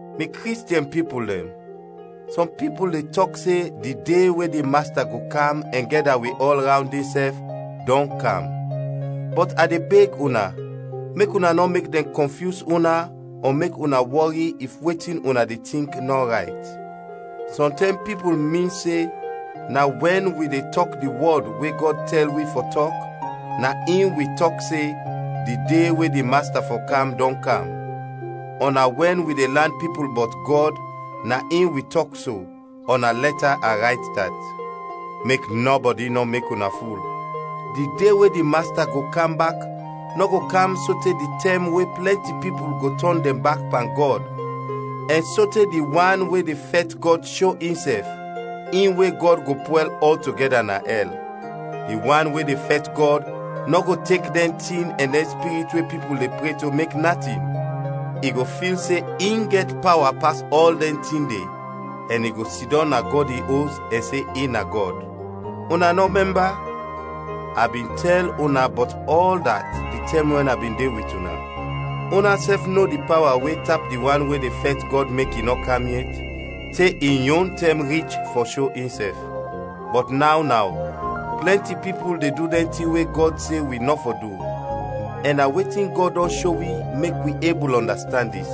Mi Kristiɛn pipul dɛn, sɔm pipul de tɔk se di De we di Masta go kam ɛn gɛda wi ɔl rawnd insɛf, dɔn kam, bɔt a de beg una, mek una nɔ mek dɛn kɔnfyus una ɔ mek una wɔri if wetin una de tink nɔ rayt. Sɔntɛm pipul min se na wɛn wi de tɔk di wɔd we Gɔd tɛl wi fɔ tɔk na in wi tɔk se di de we di Masta fɔ kam dɔn kam, ɔ na wɛn wi de lan pipul bɔt Gɔd na in wi tɔk so, ɔ na lɛta a rayt dat. Mek nɔbɔdi nɔ mek una ful. Di de we di Masta go kam bak nɔ go kam sote di tɛm we plɛnti pipul go tɔn dɛn bak pan Gɔd ɛn sote di wan we de fɛt Gɔd sho insɛf, in we Gɔd go pwɛl ɔltogɛda na ɛl. Di wan we de fɛt Gɔd nɔ go tek dɛn tin ɛn dɛn spirit we pipul de pre to mek natin. I go fil se in gɛt pawa pas ɔl dɛn tin de ɛn i go sidɔm na Gɔd in Os ɛn se in na Gɔd. Una nɔ mɛmba? A bin tɛl una bɔt ɔl dat di tɛm we a bin de wit una. Unasɛf no di pawa we tap di wan we de fɛt Gɔd mek i nɔ kam yet, te in yon tɛm rich fɔ sho insɛf. Bɔt naw naw plɛnti pipul de du dɛn tin we Gɔd se wi nɔ fɔ du, ɛn na wetin Gɔd dɔn sho wi mek wi ebul ɔndastand dis.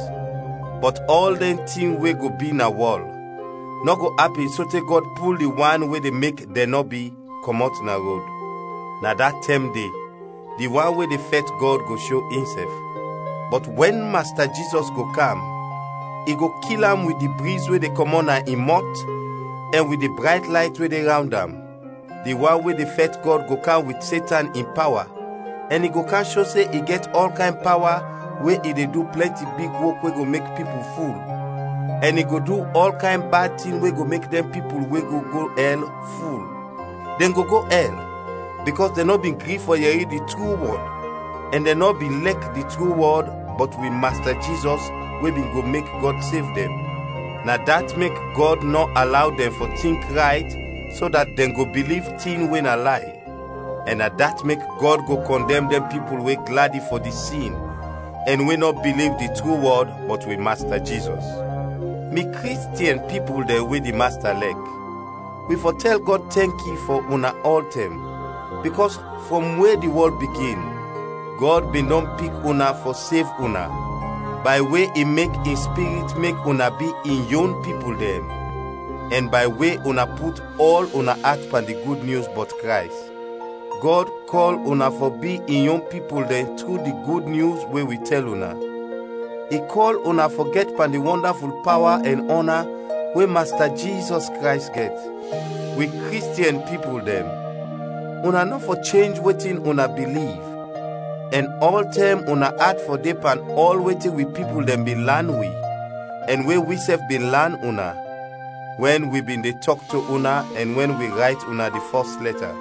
Bɔt ɔl dɛn tin we go bi na wɔl, nɔ go apin sote Gɔd pul di wan we de mek dɛn nɔ bi, kɔmɔt na rod. Na da tɛm de di wan we de fɛt Gɔd go sho insɛf. Bɔt wɛn Masta Jizɔs go kam, i go kil am wit di briz we de kɔmɔt na in mɔt ɛn wit di brayt layt we de rawnd am. Di wan we de fɛt Gɔd go kam wit Setan in pawa ɛn i go kam sho se in gɛt ɔl kayn pawa we i du plɛnti big wok we go mek pipul ful, ɛn i go du ɔl kayn bad tin we go mek dɛn pipul we go go ɛl, ful. Dɛn go go ɛl, bikɔs dɛn nɔ bin gri fɔ yɛri di tru wɔd ɛn dɛn nɔ bin lɛk di tru wɔd bɔt wi Masta Jizɔs we bin go mek Gɔd sev dɛn. Na dat mek Gɔd nɔ alaw dɛn fɔ tink rayt so dat dɛn go biliv tin we na lay. Ɛn na dat mek Gɔd go kɔndɛm dɛn pipul we gladi fɔ de sin ɛn we nɔ biliv di tru wɔd bɔt wi Masta Jizɔs. Mi Kristiɛn pipul dɛn we di Masta lɛk, wi fɔ tɛl Gɔd tɛnki fɔ una ɔltɛm, bikɔs frɔm we di wɔl bigin, Gɔd bin dɔn pik una fɔ sev una bay we i mek in Spirit mek una bi in yon pipul dɛn ɛn bay we una put ɔl una at pan di Gud Nyus bɔt Krays. Gɔd kɔl una fɔ bi in yon pipul dɛn tru di Gud Nyus we wi tɛl una; i kɔl una fɔ gɛt pan di wɔndaful pawa ɛn ɔna we Masta Jizɔs Krays gɛt. Wi Kristiɛn pipul dɛn, una nɔ fɔ chenj wetin una biliv, ɛn ɔltɛm una at fɔ de pan ɔl wetin wi pipul dɛn bin lan wi, ɛn we wisɛf bin lan una, wɛn wi bin de tɔk to una ɛn wɛn wi rayt una di fɔs lɛta.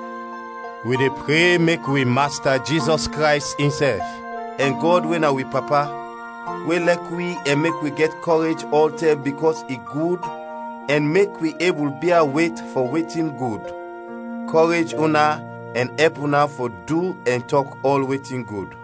Wi de pre mek wi Masta Jizɔs Krays insɛf, ɛn Gɔd we na wi Papa, we lɛk wi ɛn mek wi gɛt kɔrej ɔltɛm bikɔs i gud ɛn mek wi ebul bia wet fɔ wetin gud, kɔrej una ɛn ɛp una fɔ du ɛn tɔk ɔl wetin gud.